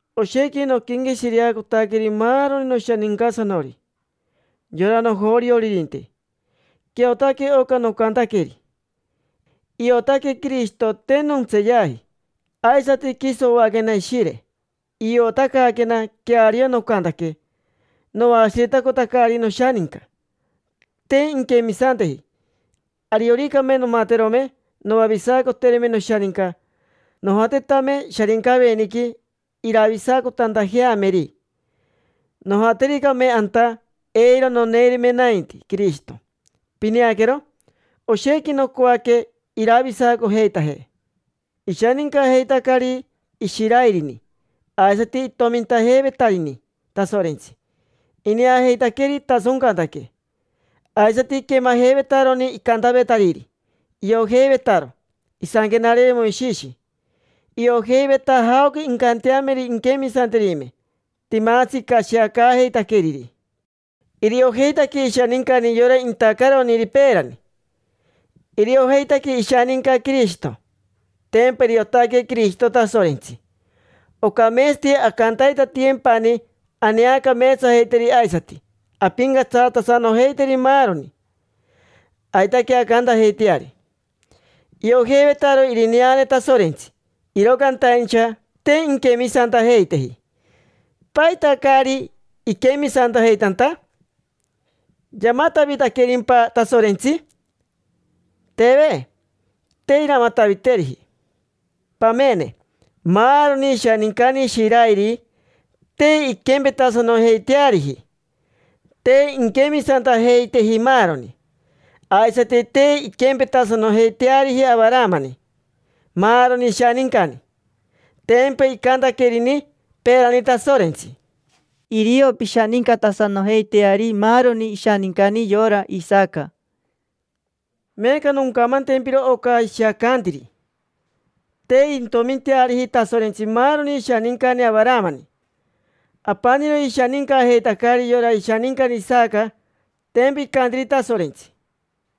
Oshequi noquenqueshireacotaqueri maaroni noshanincasanori, yora nojorioririnte. Queariotaque oca nocantaqueri, iotaque Quirishito te nontseeyaji. Aisati quiso oaquena Ishire, iotacaaquena queario nocantaque. Noashiretacotacari noshaninca, te inquemisanteji. Arioricame nomaterome noavisacoterime noshaninca, nojatetame Sharincaveniqui iravisacotantajeameri; nojatericame anta, eiro noneirime nainti Quirishito; pineaquero, oshequi nocoaque iravisacojeitaje. Ishanincajeitacari Ishirairini aisati itomintajeivetarini Tasorentsi. Ineajeitaqueri itasoncantaque, aisati iquemajeivetaroni icantavetariri, iojeivetaro Isanquenare Moishishi, iojeiveta jaoca incanteameri inquemisanterime, timatsi icashiacaajeitaqueriri, iriojeitaque ishanincani yora intacaroniri peerani, iriojeitaque ishaninca Quirishito. Tempa iriotaque Quirishito Tasorentsi, ocameetsati ancantaitatiyempani aneacameetsajeiteri aisati ampincatsatasanojeiteri maaroni. Aitaque ancantajeiteari. Iojeivetaro irineane Tasorentsi, iro cantaincha te inquemisantajeiteji. ¿Paita caari iquemisantajeitanta? ¿Yamatavitaquerimpa Tasorentsi? Teve, te iramataviteriji. Pamene, maaroni ishanincani Ishirairi te inquempetasanojeiteariji: te inquemisantajeiteji maaroni. Aisati te inquempetasanojeiteariji Avaramani maaroni ishanincani. Tempa icantaquerini peerani Tasorentsi: “Irio pishanincatasanojeiteari maaroni ishanincani yora Isaca”. Meeca noncamantempiro oca ishiacantiri. Te intominteariji Tasorentsi maaroni ishanincani Avaramani. Apaniro ishanincajeitacari yora ishanincani Isaca. Tempa icantiri Tasorentsi: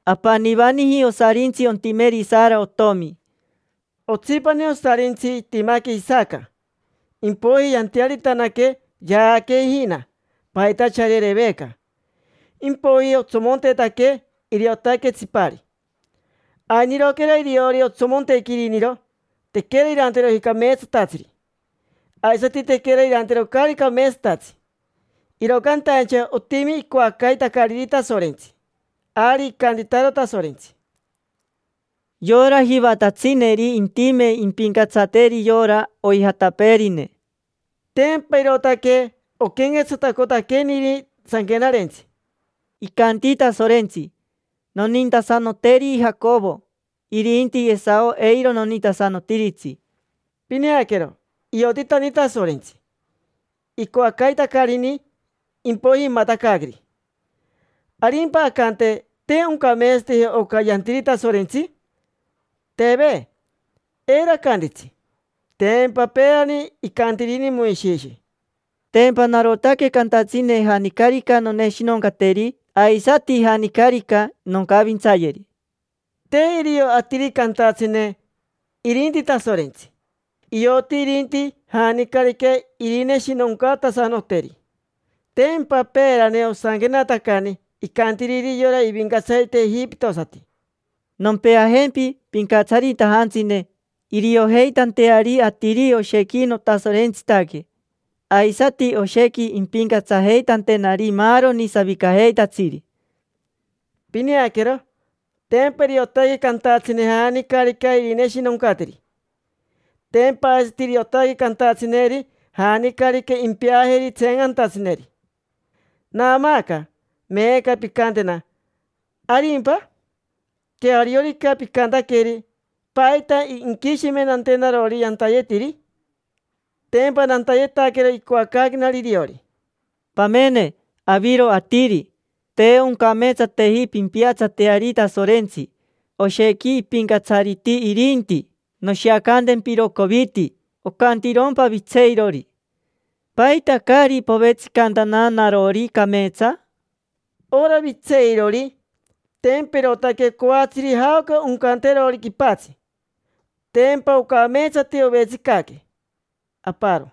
“Apanivaniji osarintsi ontimeri Sara otomi”. Otsipani osarintsi itimaque Isaca. Impoiji yantearitanaque, yaaque ijina, pajitachari Ereveca. Impoiji otsomontetaque, iriotaque tsipari. Ainiroquera iriori otsomontequi iriniro, tequera iranteroji cameetsatatsiri aisati tequera iranteroji caari cameetsatatsi, iro cantaincha otimi icoacaitacariri Tasorentsi. Ari icantitaro Tasorentsi: “Yora jivatatsineri intime impincatsateri yora oijatapeerine”. Tempa irootaque oquenquetsatacotaqueniri Sanquenarentsi: “Icanti Tasorentsi: ‘Nonintasanoteri Jacovo, irinti Esao eiro nonintasanotiritsi’”. Pineaquero, iotitani Tasorentsi icoacaitacariniri: impoiji imatacaaqueri. ¿Arimpa ancante: “Te oncameetsateji oca yantiri Tasorentsi”? Teve, eiro acantitsi. Tempa peerani icantirini Moishishi: “Tempa narotaque cantatsine janicarica noneshinoncateri, aisati janicarica noncavintsayeri”. Te irio atiri cantatsine, irinti Tasorentsi. Ioti irinti janicarica irineshinoncatasanoteri. Tempa peerani osanquenatacani icantiriri yora ivincatsarite ejipitosati: “Nompeajempi pincatsaritajantsine, iriojeitanteari atiri oshequi notasorentsitaque, aisati oshequi impincatsajeitantenari maaroni savicajeitatsiri”. Pineaquero, tempa iriotaque cantatsine janicarica irineshinoncateri. Tempa aisati iriotaque cantatsineri janicarica impeajeri tseencantatsineri. Naamaaca meeca pincantena: “¿Arimpa? Queariorica picantaqueri, ¿paita inquishimentantenarori nantayetiri? Tempa nantayetaquero icoacaaquenari iriori”. Pamene, aviro atiri: te oncameetsateji pimpiatsateari Tasorentsi, oshequi ipincatsariti irinti. Noshiacantempiro coviti. Ocantirompa vitseirori: “¿Paita caari povetsicantana narori cameetsa?” Ora vitseirori, tempa irootaque coatsiri jaoca oncanterori quipatsi. Tempa ocameetsati ovetsicaque aparo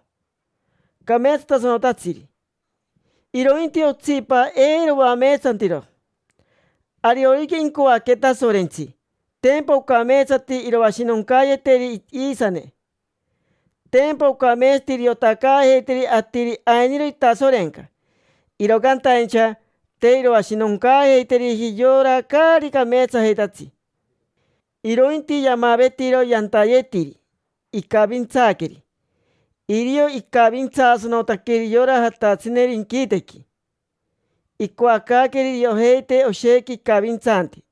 cameetsatasanotatsiri, irointi otsipa eiro oameetsantiro. Ariorica incoaque Tasorentsi, tempa ocameetsati iroashinoncaayeteri iisane. Tempa ocameetsati iriotacaajeiteri atiri ainiro itasorenca. Iro cantaincha te iroashinoncaajeiteriji yora caari cameetsajeitatsi, irointi yamavetiro yantayetiri, icavintsaaqueri. Irio icavintsaasanotaqueri yora jatatsineri inquitequi; icoacaaqueri iriojeite oshequi icavintsanti,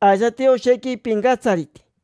aisati oshequi ipincatsariti.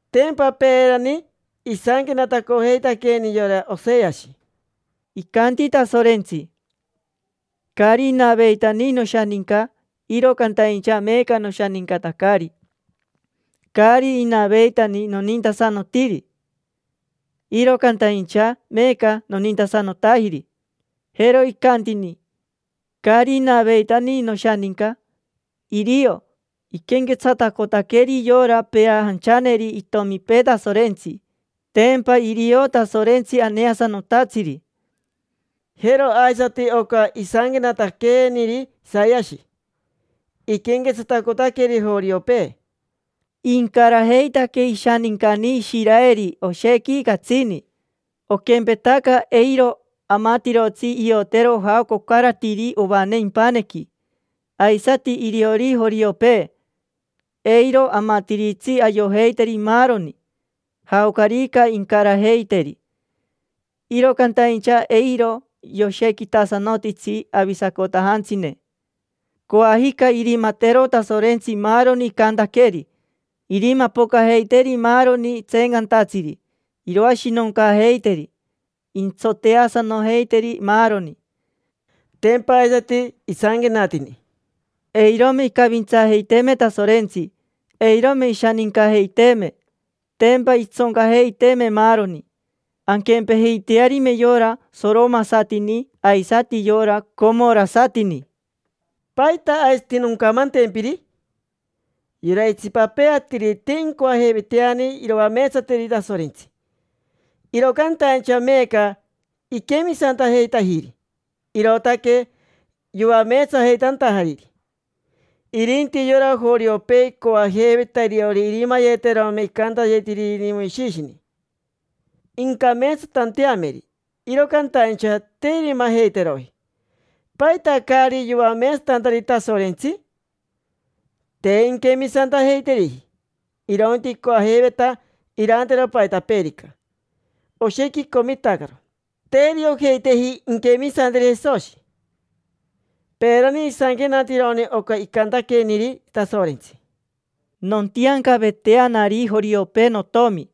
Tempa peerani isanquenatacojeitaqueeni yora Oseashi: “Icanti Tasorentsi: ‘Caari inaveitani noshaninca, iro cantaincha meeca noshanincatacari. Caari inaveitani nonintasanotiri, iro cantaincha meeca nonintasanotajiri’”. Jero icantini: “Caari inaveitani noshaninca”. Irio iquenquetsatacotaqueri yora peajanchaneri itomipee Tasorentsi; tempa irio Tasorentsi aneasanotatsiri. Jero aisati oca isanquenataqueniri Isayashi. Iquenquetsatacotaqueri joriopee: “Incarajeitaque ishanincani Ishiraeri oshequi catsini. Oquempetaca eiro amatirotsi iotero jaoca ocaratiri ovane impanequi, aisati iriori joriopee, eiro amatiritsi ayojeiteri maaroni, jaocarica incarajeiteri. Iro cantaincha eiro yoshequitasanotitsi avisacotajantsine. Coajica irimatero Tasorentsi maaroni icantaqueri: irimapocajeiteri maaroni tseencantatsiri, iroashinoncaajeiteri. Intsoteasanojeiteri, maaroni”. Tempa aisati isanquenatini: “Eirome icavintsaajeiteeme Tasorentsi, eirome ishanincajeiteeme, tempa intsoncajeiteeme maaroni, anquempejeitearime yora soromasatini aisati yora comorasatini”. ¿Paita aisati noncamantempiri? Yora itsipapee atiri te incoajeiveiteani iroameetsateri Tasorentsi, iro cantaincha meeca iquemisantajeitajiri, irootaque yoameetsajeitantajariri. Irinti yora joriopee icoajeiveta iriori irimayeterome icantayetiriniri Moishishini incameetsatanteameri, iro cantaincha te irimajeiteroji. ¿Paita caari yoameetsatantari Tasorentsi? Te inquemisantajeiteriji, irointi icoajeiveta irantero paitapeerica. Oshequi icomitacaro, te iriojeiteji inquemisanteri Jesoshi. Peerani isanquenatironi oca icantaqueniri Tasorentsi: “Nontiancaveteanari joriopee notomi,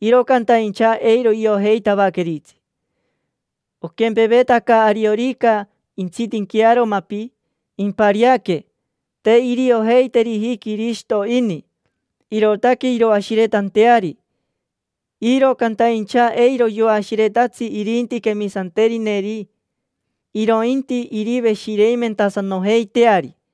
iro cantaincha eiro iojeitavaqueritsi. Oquempevetaca ariorica intsitinquearo mapi, impariaque; te iriojeiteriji Quirishito ini, irootaque iroashiretanteari. Iro cantaincha eiro yoashiretatsi irinti quemisanterineri, irointi iriveshireimentasanojeiteari”.